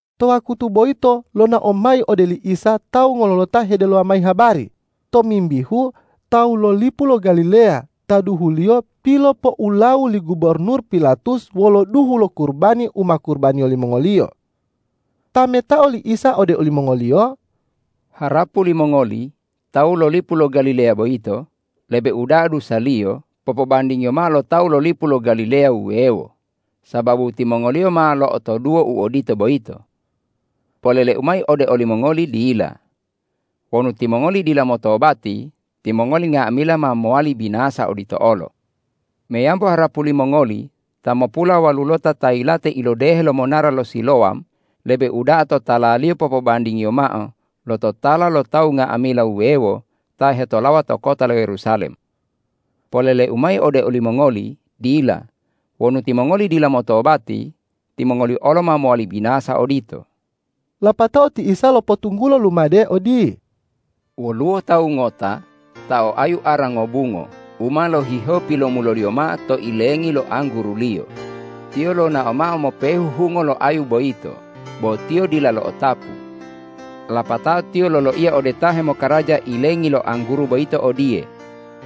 To wakutu boyito lonao mayi ode li Isa tawu ngololota hedelowa mayi habari tomimbihu tawu lo lipu lo Galileya ta duhuliyo pilopoulawu li gubornur Pilatus wolo duhu lo kurubani u ma kurubaniyo limongoliyo. Tametao li Isa ode olimongoliyo,”Harapu limongoli tawu lo lipu lo Galileya boyito lebe uda'a dusaliyo popobandingiyo mao lo tawu lo lipu lo Galileya wuwewo, sababu timongoliyo ma lo'otoduwo u odito boyito? Polele-U mayi ode olimongoli: Dila! Wonu timongoli dila motobati, timongoli nga'amila ma mowali binasa odito olo. Meyambo harapu limongoli ta mopulawalulota ta yilate ilodehe lo monara to Silowam, lebe uda'a totalaliyo popobandingiyo mao lo totala lo tawu nga'amila wuwewo ta hetolawa to kota lo Yerusalem? Polele-U mayi ode olimongoli: Dila! Wonu timongoli dila motobati, timongoli olo ma mowali binasa odito.” Lapatao ti Isa lopotunggulo lumade odiye,”Woluwo tawu ngota ta o ayu ara ngobungo u ma lohihewo pilomuloliyo mao to ilengi lo angguruliyo. Tiyo lonao mao mopehu hungo lo ayu boyito, bo tiyo dila lo'otapu. Lapatao tiyo loloiya ode ta hemokaraja ilengi lo angguru boyito odiye,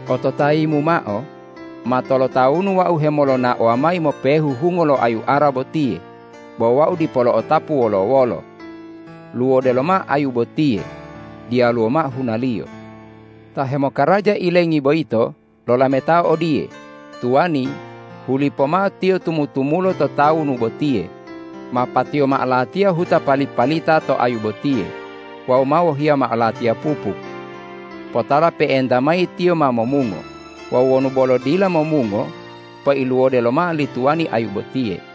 ’Ototayimu mao, ma tolotawunu wau hemolonaowa mayi mopehu hungo lo ayu ara botiye, bo wau dipo lo'otapu wolo-wolo. Luwode lomao ayu botiye! Diyaluwo mao hunaliyo!’ Ta hemokaraja ilengi boyito lolametao odiye, ’Tuwani, hulipo mao tiyo tumu-tumulo to tawunu botiye, ma patiyo mao latiya huta pali-palita to ayu botiye wawu ma wohiya mao latiya pupuk. Potala pe'enta mayi tiyo ma momungo. Wawu wonu bolo dila momungo, peiluwode lomao li tuwani ayu botiye.’”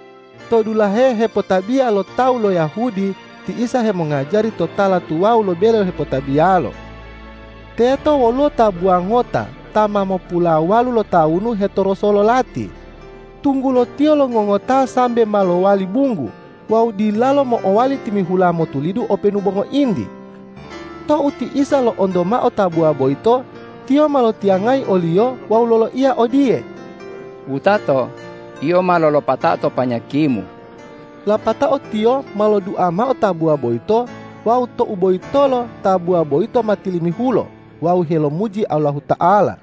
To dulahe hepotabiya lo tawu lo Yahudi ti Isa hemongajari to tala tuwawu lo bele hepotabiyalo. Teto woluwo tabuwa ngota ta ma mopulawalu lotawunu hetoroso lo lati, tunggulo tiyo longongoto sambe ma lowali bunggu wawu dilalo mo'owali timihula motulidu openu bo ngointi. Tou ti Isa lo'onto mao tabuwa boyito, Tiyo ma lotiyangayi oliyo wawu loloiya odiye,”Wutato, yio ma lolopatao to panyakimu!” Lapatao Tiyo ma lodua mao tabuwa boyito wawu tou boyitolo tabuwa boyito ma tilimihulo wawu helomuji Allahuta'ala.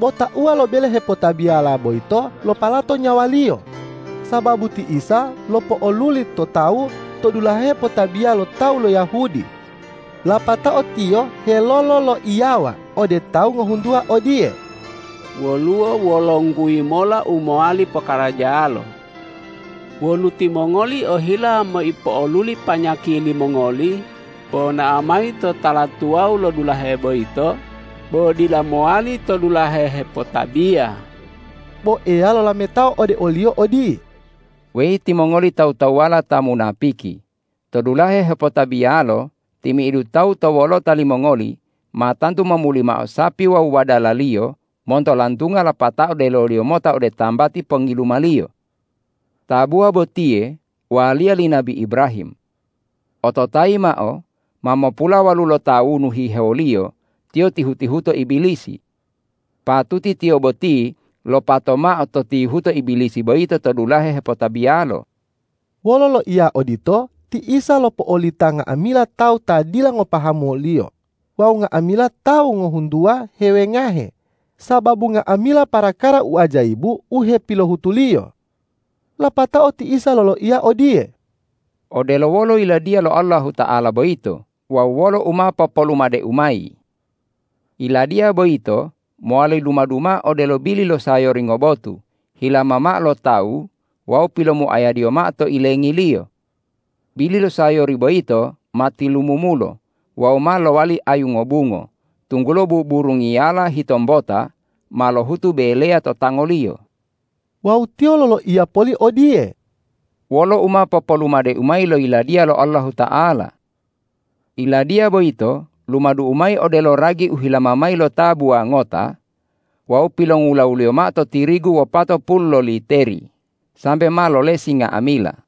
Bo tauwa lo bele hepotabiyala boyito lopalato nyawaliyo, sababu ti Isa lopo'oluli to tawu to dulahe hepotabiya lo tawu lo Yahudi. Lapatao tiyo helololoiyawa ode tawu ngohuntuwa odiye,”Woluwo wolongguyi mola u mowali pokarajalo. Wonu timongoli ohila meipo'oluli panyaki limongoli, ponao mayi to tala tuwawu lo dulahe boyito, bo dila mowali to dulahe hepotabiya!” Bo Eya lolametao ode oliyo odiye,”Weyi timongoli tawu-tawuwala ta munapiki, to dulahe hepotabiyalo, timi'idu tawu to wolota limongoli ma tantu momuli mao sapi wawu wadalaliyo monto lantunga lapatao deloliyo mota ode tambati pongilumaliyo. Tabuwa botiye waliya li nabi Ibrahim. Ototayi mao: Ma mopulawalu lotawunu hihewoliyo tiyo tihu-tihuto Ibilisi. Patuti tiyo boti lopato mao to tihuto Ibilisi boyito to dulahe hepotabiyalo.” Wolo loiya odito ti Isa lopo'olita nga'amila tawu ta dila ngopahamu wo-Liyo wawu nga'amila tawu ngohuntuwa hewengahe sababu nga'amila parakara u ajayibu, u hepilohutu-Liyo. Lapatao ti Isa loloiya odiye,”Odelo wolo Yiladiya lo Allahuta'ala boyito wawu wolo u ma popolumade-U mayi? Yiladiya boyito mowali lumadu mao odelo bili lo sayori ngobotu hilama mao lo tawu wawu pilomuayadiyo mao to ilengiliyo. Bili lo sayori boyito ma tilumumulo wawu ma lowali ayu ngobungo, tunggulo buburungiyala hitombota ma lohutu beleya to tangoliyo.” Wawu Tiyo loloiya poli odiye,”Wolo u ma popolumade-U mayi lo Yiladiya lo Allahuta'ala? Yiladiya boyito lumadu-U mayi odelo ragi u hilama mayi lo tabuwa ngota wawu pilongulawuliyo mao to tirigu wopatopulu loliteri sambe ma lolesi nga'amila.”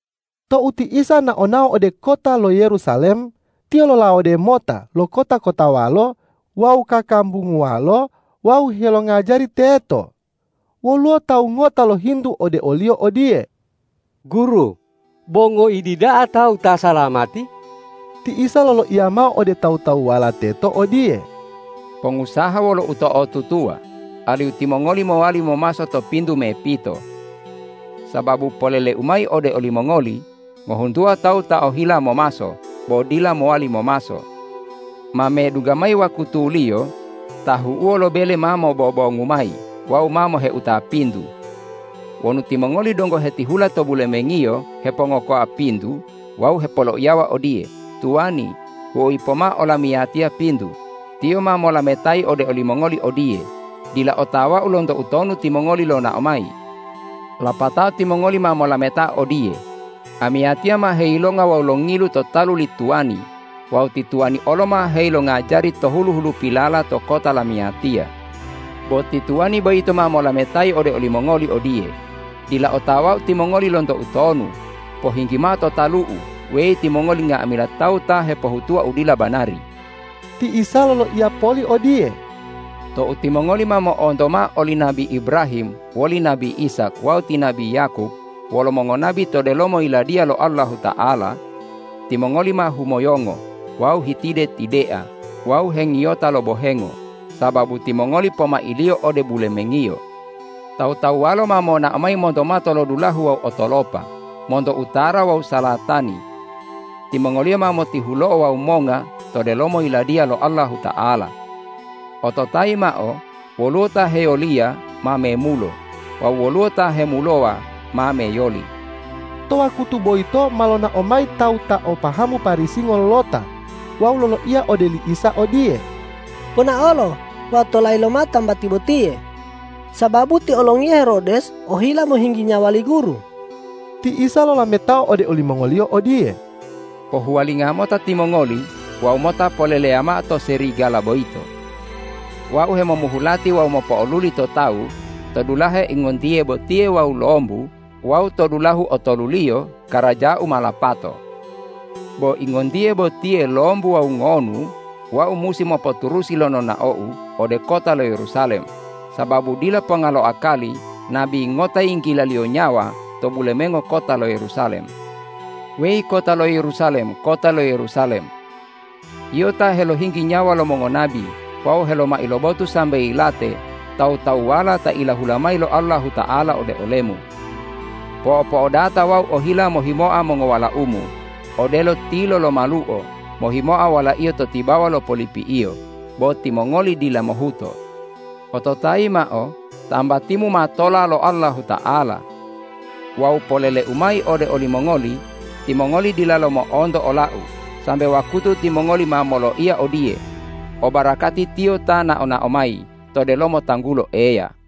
Tou ti Isa nao-nao ode kota lo Yerusalem, Tiyo lolawode mota lo kota-kotawalo wawu kakambunguwalo wawu helongajari teto. Woluwo tawu ngota lohintu ode o-Liyo odiye,”Guru, bo ngoidi da'a tawu ta salamati?” Ti Isa loloiya mao ode tawu-tawuwala teto odiye, ”Pongusaha wolo uto'otutuwa alihu timongoli mowali momaso to pintu mepito! Sababu polele-U mayi ode olimongoli: Ngohuntuwa tawu ta ohila momaso, bo dila mowali momaso. Ma medungga mayi wakutuliyo tahu'uwo lo bele ma mobobongu mayi wawu ma moheuta pintu. Wonu timongoli donggo hetihula to bulemengiyo hepongokoa pintu wawu hepoloiyawa odiye, ’Tuwani, huoyi pomao olamiyatiya pintu!’ Tiyo ma molametayi ode olimongoli odiye, ’Dila otawau lonto utonu timongoli lonao mayi!’ Lapatao timongoli ma molametao odiye, ’Amiyatiya ma heyilonga wawu longilu to talu li tuwani wawu ti tuwani olo ma heyilongajari to hulu-hulupilala to kota lamiyatiya!’ Bo ti tuwani boyito ma molametayi ode olimongoli odiye, ’Dila otawau timongoli lonto utonu. Pohinggi mao to talu-U, weyi timongoli nga'amila tawu ta hepohutuwa u dila banari!’” Ti Isa loloiya poli odiye,”Tou timongoli ma mo'onto mao oli nabi Ibrahim woli nabi Ishak wawu ti nabi Yakob wolo mongonabi to delomo Yiladiya lo Allahuta'ala, timongoli ma humoyongo wawu hetide-tidea wawu hengiyota lo bohengo, sababu timongoli pomailiyo ode bulemengiyo. Tawu-tawuwalo ma monao mayi monto matolodulahu wawu otolopa, monto utara wawu salatani. Timongoliyo ma motihulo'o wawu monga to delomo Yiladiya lo Allahuta'ala. Ototayi mao: Woluwo ta hewoliya ma memulo wawu woluwo ta hemulowa ma meyoli.” To wakutu boyito ma lonao mayi tawu ta o pahamu Parisi ngololota wawu loloiya ode li Isa odiye,”Ponaolo wawu tolayi lomao tambati botiye, sababu ti olongiya Herodes ohila mohinggi nyawa li Guru.” Ti Isa lolametao ode olimongoliyo odiye,”Pohuwalinga mota timongoli wawu mota poleleya mao to serigala boyito, ’Wau hemomuhu lati wawu mopo'oluli to tawu to dulahe ingontiye botiye wawu lombu wawu to dulahu otoluliyo karaja-U ma lapato.’ Bo ingontiye botiye, lombu wawu ngonu Wau musi mopoturusi lo nonao-U ode kota lo Yerusalem, sababu dila ponga lo akali nabi ngota yinggilaliyo nyawa to bulemengo kota lo Yerusalem. Weyi kota lo Yerusalem, kota lo Yerusalem! Yio ta helohinggi nyawa lo mongonabi wawu helomai lo botu sambe yilate tawu-tawuwala ta ilahula mayi lo Allahuta'ala ode olemu! Po'o-po'odata Wau ohila mohimoa mongowalaumu, odelo tilo lo maluo mohimoa walaiyo to tibawa lo polipi'iyo, bo timongoli dila mohuto! Ototayi mao: Tambatimu ma tola lo Allahuta'ala. Wawu polele-U mayi ode olimongoli: Timongoli dilalo mo'onto ola-U sambe wakutu timongoli ma moloiya odiye, ’O barakati Tiyo ta nao-nao mayi to delomo tanggulo Eya.’”